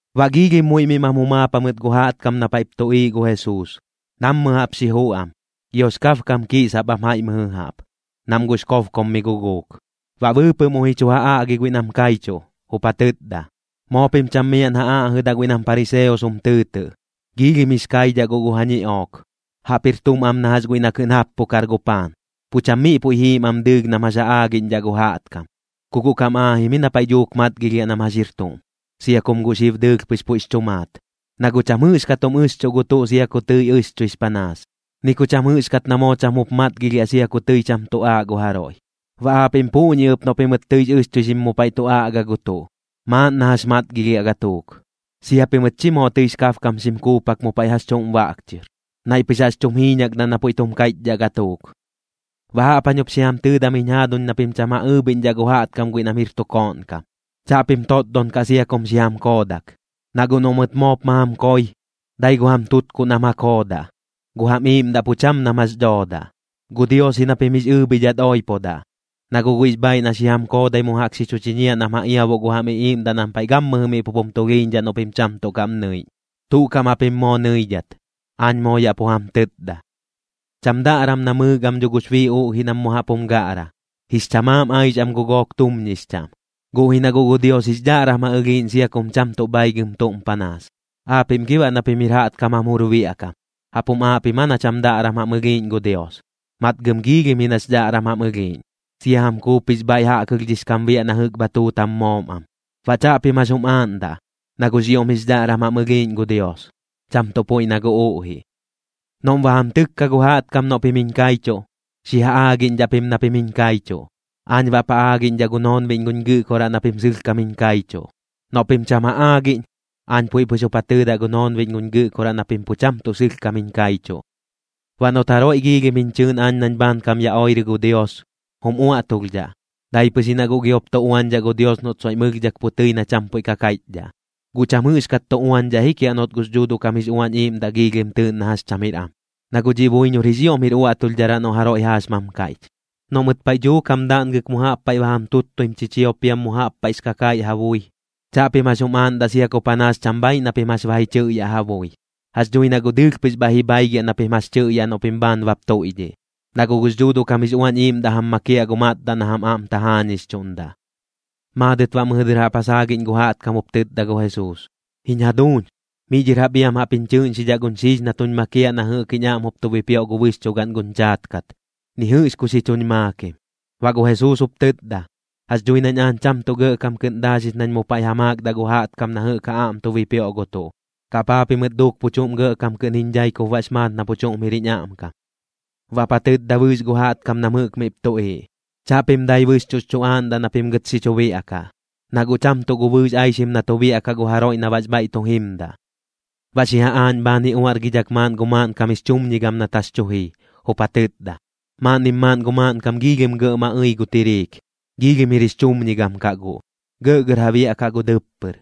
Baꞌ giilhim muiꞌ miꞌ mam jumaap jamɨt gu jaꞌtkam na paiꞌp tuꞌiiꞌ gu Jesuus, nammɨ jaꞌp xi juꞌ am. Giox kabkam kiꞌsap am jaiꞌ mɨjɨ jaꞌp, nam guꞌx kobkom mi guguuk. Baꞌ bɨɨpɨꞌ muiꞌ ji chu ja aꞌgi guiꞌ nam kaichuꞌ, jup ja tɨtda: ―Moo pim cham miaꞌn ja aꞌjɨdaꞌ guiꞌ nam pariseos jum tɨɨtɨꞌ. Giilhim jix kaidhaꞌ guꞌ gu ja ñiꞌook, jaꞌp jir tuꞌm am na jax guiꞌ na kɨꞌn jappukar gu paan, pu cham miꞌ puiꞌ jiim am dɨɨlh nam jax ja aagiꞌñdhaꞌ gu jaꞌtkam. Ku guꞌ kam aajim ji na paiꞌ dhuuk matgilhiaꞌ nam jax jir tuꞌm, sia kum guꞌ xib dɨɨlh pɨx puiꞌx chu maat. Na guꞌ cham jɨꞌxkat jum ɨxchuꞌ gu tuꞌ sia ku tɨi ɨxchuix panaas, ni ku cham jɨꞌxkat na moo cham jup matgilhiaꞌ sia ku tɨi cham tu aaꞌ gu jaroiꞌ. Baꞌ aapiꞌm puꞌñi ɨp noꞌ pimɨt tɨix ɨxchuixim mu paiꞌ tu aꞌga gu tuꞌ, maaꞌn na jax matgilhiaꞌ gatuuk. Sia pimɨt chi moo tɨix kabkam xim kuupak mu paiꞌ jax chuꞌm baꞌk chɨr, naiꞌ pɨx jaꞌx chum jiiñakdaꞌ na puiꞌ tum kaiꞌchdhaꞌ gatuuk. ’Baꞌ jaꞌp jañ jup xi jam tɨɨdam jiñ jaaduñ na pim cham ja ɨɨbhiꞌñdhaꞌ gu jaꞌtkam guiꞌ nam jir tu kooꞌn kam, chaꞌpim totdon kaꞌ sia kum xi jam koodak. Na guꞌ noꞌ mɨt moop ma jam koi, dai gu jam tutkuꞌ nam ja koodaꞌ, gu jam iꞌiiꞌmdaꞌ pu cham nam jax dhoodaꞌ. Gu Dios ji na pim jix ɨɨbhidhat oipodaꞌ, na guꞌ guiꞌx bhaaiꞌ na xi jam koodai mu jaꞌk xi chu chiñiaꞌ nam ja iabuꞌ gu jam iꞌiiꞌmdaꞌ nam paiꞌ gammɨjɨ miꞌ pup jum tulhiiñdhaꞌ noꞌ pim cham tuꞌ kaꞌm nɨiꞌñ. Tuꞌ kaꞌm japim moo nɨidhat, aañ moo yaꞌ pu jam tɨtda. ’Cham daꞌram namɨɨk am dho gux bii uꞌjiꞌ nam mu jaꞌp jum gaꞌra, jix chamaam aix am gu gook tumñix chaꞌm. Guꞌ ji na guꞌ gu Dios jix dhaꞌram ja ɨlhiiꞌñ sia kum cham tuꞌ bhaigɨm tuꞌm panaas. Aapiꞌm gi baꞌ na pim jir jaꞌtkam jam jur biaꞌ kam, ¿jaꞌp jum aaꞌ pim aa na cham daꞌram jam ɨlhiiꞌñ gu Dios? Matgɨm giilhim ji nax dhaꞌram jam ɨlhiiꞌñ, sia jam kuup jix bhaiꞌ jaꞌkɨlhdhix kam biaꞌ na jɨꞌk bha tuut jam moom am. Baꞌ chaꞌpim jax jum aaꞌndaꞌ, na guꞌx ioꞌm jix dhaꞌram jam ɨlhiiꞌñ gu Dios, cham tuꞌ puiꞌ na gu uꞌjiꞌ. ’Noꞌm ba jam tɨkka gu jaꞌtkam noꞌ pim jiñ kaichuꞌ, xi ja aagiꞌñdhaꞌ pim na pim jiñ kaichuꞌ, aañ baꞌp ja aagiꞌñdhaꞌ gu noonbiꞌñ guñ Gɨꞌkoraꞌ na pim sɨlhkam jiñ kaichuꞌ. Noꞌ pim cham ja aagiꞌñ, aañ puiꞌ pɨx jup ja tɨɨdaꞌ gu noonbiꞌñ guñ Gɨꞌkoraꞌ na pim pu cham tuꞌ sɨlhkam jiñ kaichuꞌ. ’Baꞌ noꞌt jaroiꞌ giilhim jiñ chɨɨꞌn aañ nañ bhaankam ya oirɨ gu Dios, jum uaꞌtulhdhaꞌ, dai pɨx ji na guꞌ giop tu uañdhaꞌ gu Dios noꞌt soiꞌm ɨlhdhak pu tɨi na cham puiꞌ ka kaiꞌchdhaꞌ. Guꞌ cham jɨꞌxkat tu uañdhaꞌ ji kiaꞌ noꞌt gux Dhuuduꞌ kam jix Uañ Iiꞌmdaꞌ giilhim tɨɨꞌn na jax cham jir am, na guꞌ dhiꞌ buiñor jix ioꞌm jir uaꞌtulhdharaꞌ noꞌ jaroiꞌ jaaxmam kaiꞌch. ’Noꞌ mɨt paiꞌ dhuuk jam daꞌngɨk mu jaꞌp paiꞌ ba jam tuttuim chichiop piam mu jaꞌp paiꞌx kakaiꞌ ja bui, chaꞌpim jax jum aaꞌndaꞌ sia ku panaas cham bhaaiꞌ na pim jax ba ji chɨꞌyaꞌ ja bui. Jax dhui na guꞌ dɨɨlh pɨx bhaiꞌ ji bhaigiaꞌ na pim jax tɨꞌyaꞌ noꞌ pim bhaan bap tuiꞌdhiꞌ, na guꞌ gux Dhuuduꞌ kam jix Uañ Iiꞌmdaꞌ jam makiaꞌ gu matdaꞌ na jam aꞌm tajaañixchuꞌndaꞌ. Maadɨt baꞌ mɨjɨ dɨr jaꞌp ja saagiꞌñ gu jaꞌtkam jup tɨtda gu Jesuus: ―Jiñ jaduuñ, miꞌ dhɨr jap iam jaꞌp jiñ chɨɨꞌñxidhaꞌ guñ xiix na tuñ makiaꞌ na jɨꞌk jiñ aꞌm jup tuñ bipioꞌ gu bɨxchugaꞌn guñ chaat kat. Ni jɨꞌx ku xi chuñ maakim. Baꞌ gu Jesuus jup tɨtda: ―Jax dhui nañ aañ cham tuꞌ gɇꞌkam kɨꞌn daaxix nañ mu paiꞌ ja maakdaꞌ gu jaꞌtkam na jɨꞌk ja aꞌm tu bipioꞌ gu tuꞌ. ¿Kaꞌ paa pimɨt duuk pu chuꞌm kɨꞌn gɇꞌkam jiñ dhai kup baꞌx maat na pu chuꞌm jir jiñ aꞌmkam? Baꞌp ja tɨtda bɨɨx gu jaꞌtkam nam jɨꞌk miꞌp tuꞌiiꞌ: ―Chaꞌpim dai bɨxchuꞌx chu aaꞌndaꞌ na pim gɨt xi chu biaꞌkaꞌ, na guꞌ cham tuꞌ gu bɨɨx aixim na tu biaꞌkaꞌ gu jaroiꞌ na baꞌx bhaiꞌ tu jimdaꞌ. Baꞌ xi ja aaꞌñ bhaan ji uaꞌrgidhak maaꞌn gu maaꞌnkam jix chumñigam nat jax tu jii, jup ja tɨtda: ―Maaꞌnnim maaꞌn gu maaꞌnkam giilhim gɇꞌ ma ɨi gu tiriik. Giilhim jir jix chumñigam kaꞌ guꞌ, gɇꞌgɇr ja biaꞌkaꞌ gu dɨppɨr.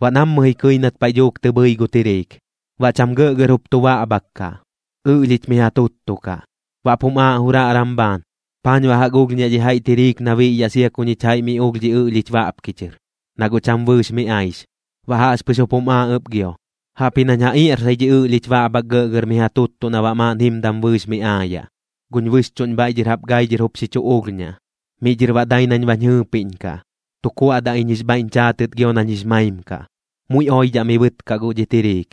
Baꞌ nammɨ ji kɨi nat paiꞌ dhuuk tɨ bhɨi gu tiriik. Baꞌ cham gɇꞌgɇr jup tu baꞌbhak kaꞌ, ɨꞌlhich miꞌ ja tuttu kaꞌ. Baꞌp jum aaꞌ juraꞌram bhaan: “¿Paañ baꞌ jaꞌk ulhñaꞌ dhi jaiꞌ tiriik na biꞌyaꞌ sia ku ñich jaiꞌ mi ulh dhi ɨꞌlhich baꞌpki chɨr, na guꞌ cham bɨɨx mi aix?” Baꞌ jaꞌxpɨx jup jum aaꞌ ɨp gio: “Jaꞌpji nañ ja iaꞌrsai dhi ɨꞌlhich baꞌbhak gɇꞌgɇr miꞌ ja tuttuꞌ na baꞌ maaꞌn jimdam bɨɨx mi aayaꞌ. Guñ bɨxchuꞌñ bhaiꞌ dhɨr jaꞌp gai dhɨr jup xi chu ulhñaꞌ. Miꞌ dhɨr baꞌ dai nañ bañ jɨɨpiꞌñkaꞌ, tu kuaꞌdaꞌ iñ jix bhaiꞌñ chaatɨt gio nañ jix maim kaꞌ. Muiꞌ oidhaꞌ mi bɨɨtkaꞌ guꞌ dhi tiriik.”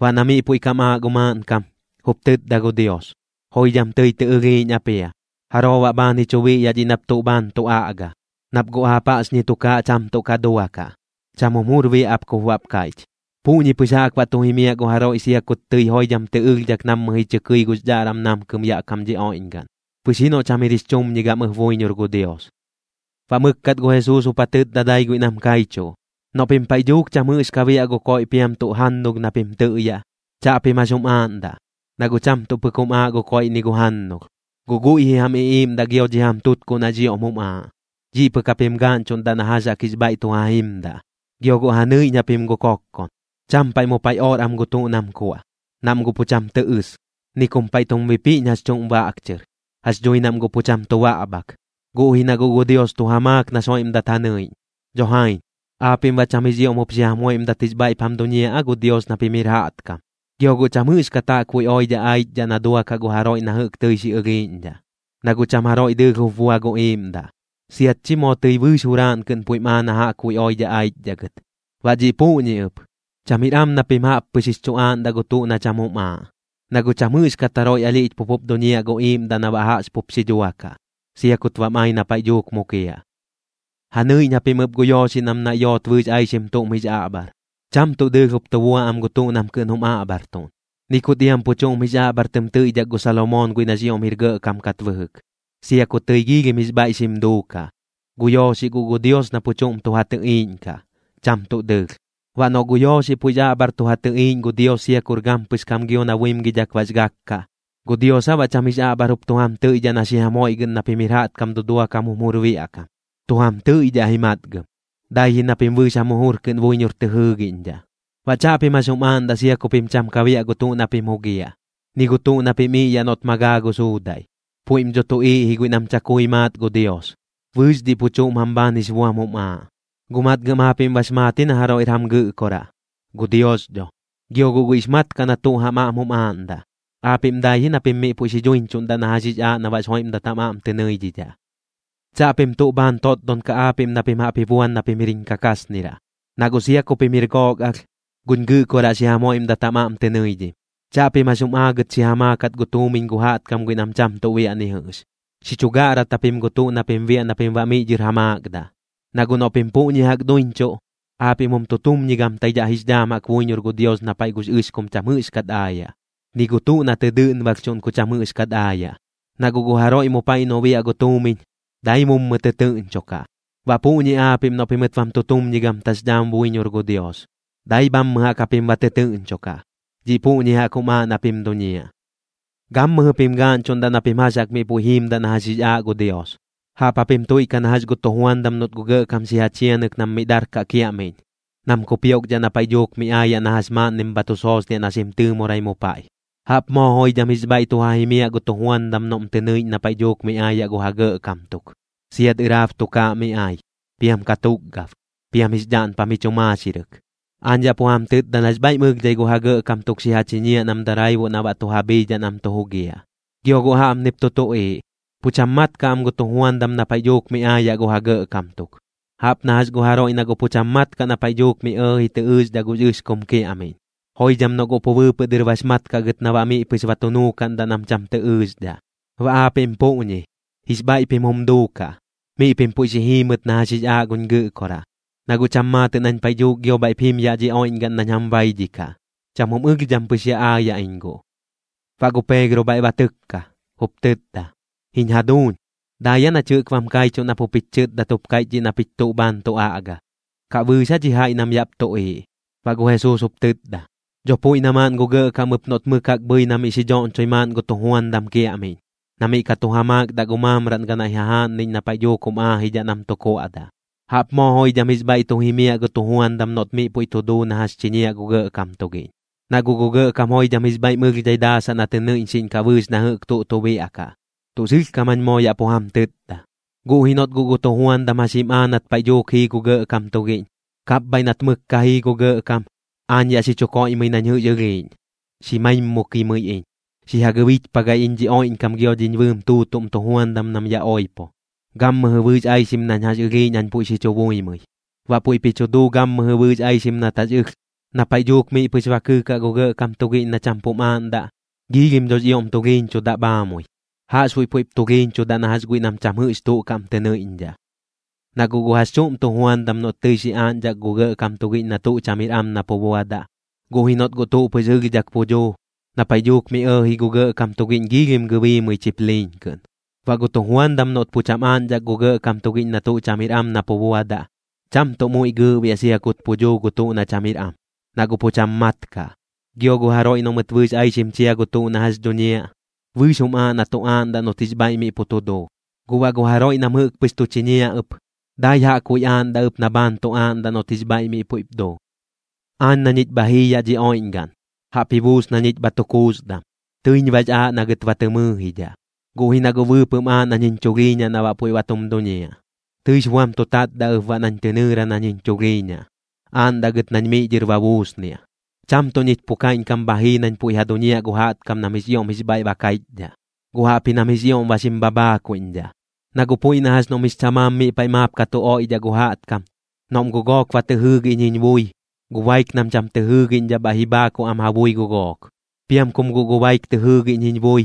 Baꞌ na miꞌ puiꞌ kam aaꞌ gu maaꞌnkam, jup tɨtda gu Dios: “Joidham tɨi tɨ ɨlhiiꞌñ ap jia. ¿Jaroo baꞌ bhaan ji chu biꞌyaꞌ dhiꞌ nap tuꞌ bhaan tu aꞌga? Nap guꞌ aap jaꞌxñi tukaaꞌ cham tuꞌ ka duakaꞌ. Cham jum jur biaꞌ ap kup baꞌp kaiꞌch.” Puꞌñi pɨx jaꞌk baꞌ tu jimiaꞌ gu jaroiꞌ sia kut tɨi joidham tɨ ɨlhdhak nammɨ ji chɨ kɨi gux dhaꞌram tu namkɨm yaꞌ kam dhi oiꞌñgaꞌn, pɨx ji noꞌ cham jir jix chumñigam ɨp buiñor gu Dios. Baꞌ mɨkkat gu Jesuus jup ja tɨtda dai guiꞌ nam kaichuꞌ: ―Noꞌ pim paiꞌ dhuuk cham jɨꞌx ka biaꞌ gu koiꞌ piam tuꞌ jannulh na pim tɨꞌyaꞌ, chaꞌpim jax jum aaꞌndaꞌ. Na guꞌ cham tuꞌ pɨk jum aaꞌ gu koiꞌ ni gu jannulh, guꞌ guiꞌ ji jam iꞌiiꞌmdaꞌ gio dhi jam tutkuꞌ nax ioꞌm jum aaꞌ, dhiꞌ pɨk japim gaaꞌñchuꞌndaꞌ na jax jaꞌk jix bhaiꞌ tu ja jimdaꞌ. Gio guꞌ ja nɨiꞌñ japim gu kokkon. Cham paiꞌ mu paiꞌ or am gu tuꞌ nam kuaꞌ, nam guꞌ pu cham tɨ ɨs. Ni kum paiꞌ tum bipiꞌñ jax chuꞌm baꞌk chɨr, jax dhui nam guꞌ pu cham tu baꞌbhak. Guꞌ ji na guꞌ gu Dios tu ja maak nax joiꞌmdat ja nɨiꞌñ. Dho jaiñ, ¿aapiꞌm baꞌ cham jix ioꞌm jup xi jam joiꞌmdat jix bhaiꞌp jam duñiaꞌ aa gu Dios na pim jir jaꞌtkam? Gio guꞌ cham jɨꞌxkat jaꞌkbuiꞌ oidhaꞌ aichdhaꞌ na duakaꞌ gu jaroiꞌ na jɨꞌk tɨi xi ɨlhiiꞌñdhaꞌ, na guꞌ cham jaroiꞌ dɨɨlh jup bua gu iiꞌmdaꞌ, siat chi moo tɨi bɨɨx juraaꞌn kɨꞌn puiꞌm aa na jaꞌkbuiꞌ oidhaꞌ aichdhaꞌ gɨt. Baꞌ dhiꞌ puꞌñi ɨp, cham jir am na pim jaꞌp pɨx jix chu aaꞌndaꞌ gu tuꞌ na cham jum aaꞌ, na guꞌ cham jɨꞌxkat jaroiꞌ alhiꞌch pup jup duñiaꞌ gu iiꞌmdaꞌ na baꞌ jaꞌx pup xi dhuakaꞌ, sia kut bam ai na paiꞌ dhuuk mukiaꞌ. ’Ja nɨiꞌñ japim ɨp gu yooxiꞌ nam naiꞌ yoot bɨɨx aixim tuꞌm jix aꞌbhar. Cham tuꞌ dɨɨlh jup tu bua am gu tuꞌ nam kɨꞌn jum aꞌbhartuꞌn, ni kut iam pu chuꞌm jix aꞌbhar tɨm tɨiꞌdhak gu Salomoon guiꞌ nax ioꞌm jir gɇꞌkam kat bɨjɨk, sia ku tɨi joidham jix bhaiꞌ xim duukaꞌ. Gu yooxiꞌ guꞌ gu Dios na pu chuꞌm tu ja tɨꞌiiꞌñkaꞌ, cham tuꞌ dɨɨlh. Baꞌ noꞌ gu yooxiꞌ puiꞌx aꞌbhar tu ja tɨꞌiiꞌñ gu Dios sia kur gampɨx kam gio na buimgidhak bax gak kaꞌ, ¿gu Dios aa baꞌ cham jix aꞌbhar jup tu jam tɨiꞌdhaꞌ na xi jam joiꞌgɨꞌn na pim jir jaꞌtkam dudua kam jum jur biaꞌ kam? Tu jam tɨiꞌdhaꞌ ji matgɨm, dai ji na pim bɨɨx jam jujur kɨꞌn buiñor tɨ jɨɨgiꞌñdhaꞌ. Baꞌ chaꞌpim jax jum aaꞌndaꞌ sia ku pim cham ka biaꞌ gu tuꞌ na pim jugiaꞌ, ni gu tuꞌ na pim iꞌyaꞌ noꞌt ma gaa gu suudaiꞌ. Puiꞌm dho tuꞌiiꞌ ji guiꞌ nam chakui maat gu Dios, bɨɨx dhiꞌ pu chuꞌm jam bhaan jix buam jum aaꞌ. Guꞌ matgɨm aapiꞌm bax maat ji na jaroiꞌr jam Gɨꞌkoraꞌ, gu Dios dho. Gio guꞌ guiꞌx mat kaꞌ na tuꞌ jam aꞌm jum aaꞌndaꞌ. Aapiꞌm dai ji na pim miꞌ puiꞌ xi dhuiñchuꞌndaꞌ na jax jix aaꞌ na baꞌx joiꞌmdat jam aꞌm tɨ nɨidhidhaꞌ. ’Chaꞌpim tuꞌ bhaan totdon kaꞌ aapiꞌm na pim jaꞌp ji buan na pim jir jiñ kakasniraꞌ, na guꞌ sia ku pim jir gook alh, guñ Gɨꞌkoraꞌ xi jam joiꞌmdat jam aꞌm tɨ nɨidhim. Chaꞌpim jax jim aagɨt xi ja maakat gu tuumiñ gu jaꞌtkam guiꞌ nam cham tuꞌ biaꞌ ni jɨꞌx. Xi chu gaꞌrat japim gu tuꞌ na pim biaꞌ na pim baꞌ miꞌ dhɨr ja maakdaꞌ. Na guꞌ noꞌ pim puꞌñi jaꞌk duiñchuꞌ, aapiꞌm jum tutumñigamtaidhaꞌ jix dhaam jaꞌk buiñor gu Dios na paiꞌ gux ɨxkum cham jɨꞌxkat aayaꞌ, ni gu tuꞌ na tɨ dɨꞌnbalhchuꞌn ku cham jɨꞌxkat aayaꞌ. Na guꞌ gu jaroiꞌ mu paiꞌ noꞌ biaꞌ gu tuumiñ, dai mummɨ tɨtɨɨꞌñchokaꞌ. Baꞌ puꞌñi aapiꞌm noꞌ pimɨt bam tutumñigamtax dhaam buiñor gu Dios, dai bhammɨ jaꞌk japim ba tɨtɨɨꞌñchokaꞌ. Dhiꞌ puꞌñi jaꞌk jum aaꞌ na pim duñiaꞌ. ’Gammɨjɨ pim gaaꞌñchuꞌndaꞌ na pim jax jaꞌk miꞌ puiꞌ jiimdaꞌ na jax jix aaꞌ gu Dios. Jaꞌp japim tuiꞌkaꞌ na jax gu tujuandam noꞌt gu gɇꞌkam xi ja chianɨk nam miꞌ darkaꞌ kiaꞌmiꞌñ nam kupioꞌkdhaꞌ na paiꞌ dhuuk mi aayaꞌ na jax maaꞌnnim bha tu soosniaꞌ na xim tɨɨmorai mu paiꞌ. Jaꞌp moo joidham jix bhaiꞌ tu ja jimiaꞌ gu tujuandam noꞌm tɨ nɨiꞌñ na paiꞌ dhuuk mi aayaꞌ gu ja gɇꞌkam tuk, siat ɨraab tukaaꞌ mi ai, piam katukgab, piam jix dhaꞌnpam ji chu maaxirɨk. Aañ yaꞌ pu jam tɨtda nax bhaiꞌm ɨlhdhai gu ja gɇꞌkam tuk xi ja chiñiaꞌ nam daraibuꞌ na baꞌ tu ja bhiidhaꞌ nam tu jugiaꞌ. Gio guꞌ jaꞌpnip tu tuꞌiiꞌ, pu cham mat kaꞌ am gu tujuandam na paiꞌ dhuuk mi aayaꞌ gu ja gɇꞌkam tuk, jaꞌp na jax gu jaroiꞌ na guꞌ pu cham mat kaꞌ na paiꞌ dhuuk mi ɇɇji tɨ ɨɨxdhaꞌ gux ɨxkum kiaꞌmiꞌñ, joidham noꞌ guꞌ pu bɨɨpɨꞌ dɨr bax mat kaꞌ gɨt na baꞌ miꞌ pɨx ba tu nuukaꞌndaꞌ nam cham tɨ ɨɨxdhaꞌ. Baꞌ aapiꞌm puꞌñi, jix bhaiꞌ pim jum duukaꞌ, miꞌ pim puiꞌ xi jiimɨt na jax jix aaꞌ guñ Gɨꞌkoraꞌ, na guꞌ cham maatɨꞌ nañ paiꞌ dhuuk gio bhaiꞌp jim yaꞌ dhi oiꞌñgaꞌn nañ jam baidhikaꞌ. Cham jum ɨlhdham pɨx ya aayaꞌ iñ guꞌ. Baꞌ gu Peegro bhaiꞌ ba tɨkka, jup tɨtda: ―Jiñ jaduuñ, ¿dai aa nach jɨꞌk bam kaichuꞌ nap jup jich chɨtdat jup kaiꞌch dhiꞌ na pich tuꞌ bhaan tu aꞌga? ¿Kaꞌ bɨɨx aa dhi jaiꞌ nam yaꞌp tuꞌiiꞌ? Baꞌ gu Jesuus jup tɨtda: ―Dho puiꞌ na maaꞌn gu gɇꞌkam ɨp noꞌt mɨk jaꞌk bhɨi na miꞌ xi dhoꞌñchoi maaꞌn gu tujuandam kiaꞌmiꞌñ, na miꞌ ka tu ja maakdaꞌ gu maamraꞌn ganaiꞌ jajaaꞌnniꞌñ na paiꞌ dhuuk jum aajidhaꞌ nam tu kuaꞌdaꞌ. Jaꞌp moo joidham jix bhaiꞌ tu jimiaꞌ gu tujuandam noꞌt miꞌ puiꞌ duu na jax chiñiaꞌ gu gɇꞌkam tugiꞌñ, na guꞌ gu gɇꞌkam joidham jix bhaiꞌm ɨlhdhai daasaꞌ na tɨ nɨiꞌñxiꞌñkaꞌ bɨɨx na jɨꞌk tuꞌ tu biaꞌkaꞌ, tuꞌ sɨlhkam jañ moo yaꞌ pu jam tɨtda. Guꞌ ji noꞌt guꞌ gu tujuandam jax jim aa nat paiꞌ dhuuk jii gu gɇꞌkam tugiꞌñ: “Kapbhaiꞌ nat mɨk ka jii gu gɇꞌkam, aañ yaꞌ xi chu koiꞌmɨi nañ jɨꞌx ɨlhiiꞌñ, xi maimukimɨi iñ, xi ja gɨbichpagai iñ dhi oiꞌñkam gio dhiñ bɨɨm tuutuꞌm tujuandam nam ya oipo, gammɨjɨ bɨɨx aixim nañ jax ɨlhiiꞌñ jañ puiꞌ xi chu buimɨi.” Baꞌ puiꞌp ji chu duu gammɨjɨ bɨɨx aixim nat jax ɨlh. Na paiꞌ dhuuk miꞌ pɨx ba kɨɨkaꞌ gu gɇꞌkam tugiꞌñ na cham pum aaꞌndaꞌ, giilhim dhox ioꞌm tulhiiñchudaꞌ bhaamui, jaꞌxbuiꞌ puiꞌp tulhiiñchudaꞌ na jax guiꞌ nam cham jɨꞌx tuꞌ kaꞌm tɨ nɨiꞌñdhaꞌ. ’Na guꞌ gu jax chuꞌm tujuandam noꞌt tɨi xi aaꞌñdhak gu gɇꞌkam tugiꞌñ na tuꞌ cham jir am na pu buadaꞌ, guꞌ ji noꞌt guꞌ tuꞌ pɨx ɨlhdhak pu dhuu, na paiꞌ dhuuk mi ɇɇji gu gɇꞌkam tugiꞌñ giilhim gɨbiimɨi chipliiñ kɨꞌn. Baꞌ gu tujuandam noꞌt pu cham aaꞌñdhak gu gɇꞌkam tugiꞌñ na tuꞌ cham jir am na pu buadaꞌ, cham tuꞌ muiꞌ gɨɨꞌbiaꞌ sia kut pu dhuu gu tuꞌ na cham jir am, na guꞌ pu cham mat kaꞌ. Gio gu jaroiꞌ noꞌ mɨt bɨɨx aixim chia gu tuꞌ na jax dhuñiaꞌ, bɨɨx jum aaꞌ na tu aaꞌndaꞌ noꞌt jix bhaiꞌ mi pu tu duu. Guꞌ baꞌ gu jaroiꞌ nam jɨꞌk pɨx tu chiñiaꞌ ɨp, dai jaꞌkbuiꞌ aaꞌndaꞌ ɨp na bhaan tu aaꞌndaꞌ noꞌt jix bhaiꞌ miꞌ puiꞌp duu. ’Aañ na ñich bha jii yaꞌ dhi oiꞌñgaꞌn, jaꞌp ji buus na ñich bha tu kuusdam, tɨiñ bax aaꞌ na gɨt ba tɨ mɨɨjidhaꞌ. Guꞌ ji na guꞌ bɨɨpɨꞌm aaꞌ nañ jiñ chulhiiñaꞌ na baꞌ puiꞌ ba tum duñiaꞌ. Tɨix buam tu tatdaꞌ ɨp baꞌ nañ tɨ nɨɨra nañ jiñ chulhiiñaꞌ, aaꞌndaꞌ gɨt nañ miꞌ dhɨr ba buusniaꞌ. Cham tuꞌ ñich pu kaiꞌñkam bha jii nañ puiꞌ ja duñiaꞌ gu jaꞌtkam nam jix ioꞌm jix bhaiꞌ ba kaiꞌchdhaꞌ, guꞌ jaꞌpji nam jix ioꞌm ba xim bhabhaakuiꞌñdhaꞌ. Na guꞌ puiꞌ na jax noꞌm jix chamaam maap miꞌ paiꞌ ka tu oiꞌdhaꞌ gu jaꞌtkam, noꞌm guꞌ gook ba tɨ jɨɨgiꞌñ jiñ bui, gu baik nam cham tɨ jɨɨgiꞌñdhaꞌ bhaiꞌ ji bhaakuꞌ am ja bui gu gook. Piam kum guꞌ gu baik tɨ jɨɨgiꞌñ jiñ bui,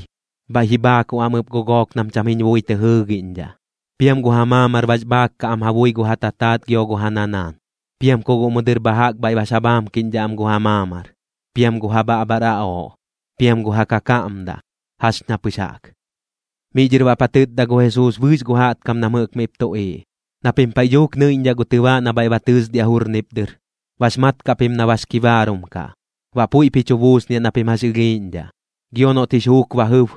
bhaiꞌ ji bhaakuꞌ am ɨp gu gook nam cham jiñ bui tɨ jɨɨgiꞌñdhaꞌ. Piam gu ja maamar bax bhaak kaꞌ am ja bui gu ja tataat gio gu ja nanaan, piam ku guꞌ mu dɨr bha jaꞌk bhaiꞌ bax ja bhaamkiꞌñdhaꞌ am gu ja maamar. Piam gu ja bhaꞌbhar aꞌooꞌ, piam gu ja kakaꞌmdaꞌ, jax ña pɨx jaꞌk. Miꞌ dhɨr baꞌp ja tɨtda gu Jesuus bɨɨx gu jaꞌtkam nam jɨꞌk miꞌp tuꞌiiꞌ: ―Na pim paiꞌ dhuuk nɨiꞌñdhaꞌ gu tɨbaaꞌ na bhaiꞌ ba tɨɨsdiaꞌ jurnip dɨr, bax mat kaꞌ pim na bax kibaarum kaꞌ, baꞌ puiꞌp ji chu buusniaꞌ na pim jax ɨlhiiꞌñdhaꞌ. Gio noꞌt jix juuk ba jɨb,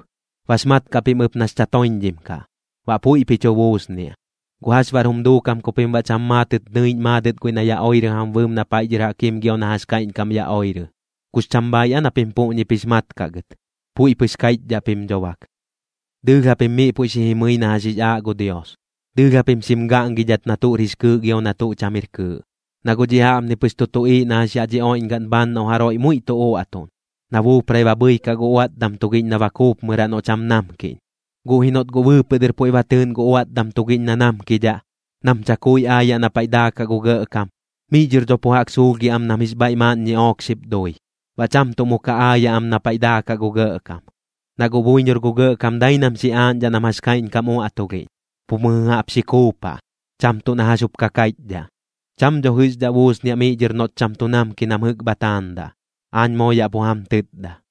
bax mat kaꞌ pim ɨp nax chatoiñdhim kaꞌ, baꞌ puiꞌp ji chu buusniaꞌ. ¿Guꞌ jax baꞌr jum duukam ku pim baꞌ cham maatɨt nɨiꞌñ maadɨt guiꞌ na ya oirɨ jam bɨɨm na paiꞌ dhɨr jaꞌk jim gio na jax kaiꞌñkam ya oirɨ? ¿Kux cham bhaaiꞌ aa na pim puꞌñip jix mat kaꞌ gɨt? Puiꞌ pɨx kaiꞌchdhaꞌ pim dho bak. ’Dɨɨlh japim miꞌ puiꞌ xi jimɨi na jax jix aaꞌ gu Dios, dɨɨlh japim xim gaꞌngidhat na tuꞌr jix kɨɨꞌ gio na tuꞌ cham jir kɨɨꞌ. Na guꞌ dhiꞌ jaꞌpni pɨx tu tuꞌiiꞌ na jax yaꞌ dhi oiꞌñgaꞌn bhaan noꞌ jaroiꞌ muiꞌ tu uaꞌtuꞌn, na buuprai ba bhɨikaꞌ gu uaꞌtdam tugiꞌñ na ba kuupmɨraꞌ noꞌ cham namkiꞌñ. Guꞌ ji noꞌt guꞌ bɨɨpɨꞌ dɨr puiꞌ ba tɨɨꞌn gu uaꞌtdam tugiꞌñ na namkidhaꞌ, nam chakui aayaꞌ na paiꞌ daakaꞌ gu gɇꞌkam, miꞌ dhɨr dho pu jaꞌk suulhgiaꞌ am nam jix bhaiꞌ maaꞌn ñiꞌook xip dui, baꞌ cham tuꞌ mu ka aayaꞌ am na paiꞌ daakaꞌ gu gɇꞌkam. Na guꞌ buiñor gu gɇꞌkam dai nam xi aaꞌñdhaꞌ nam jax kaiꞌñkam uaꞌtulhiꞌñ, pu mɨjɨ jaꞌp xi kuupaꞌ, cham tuꞌ na jax jup ka kaiꞌchdhaꞌ. Cham dho jɨꞌxdhaꞌ buusniaꞌ miꞌ dhɨr noꞌt cham tu namki nam jɨꞌk bha taandaꞌ, aañ moo yaꞌ pu jam tɨtda.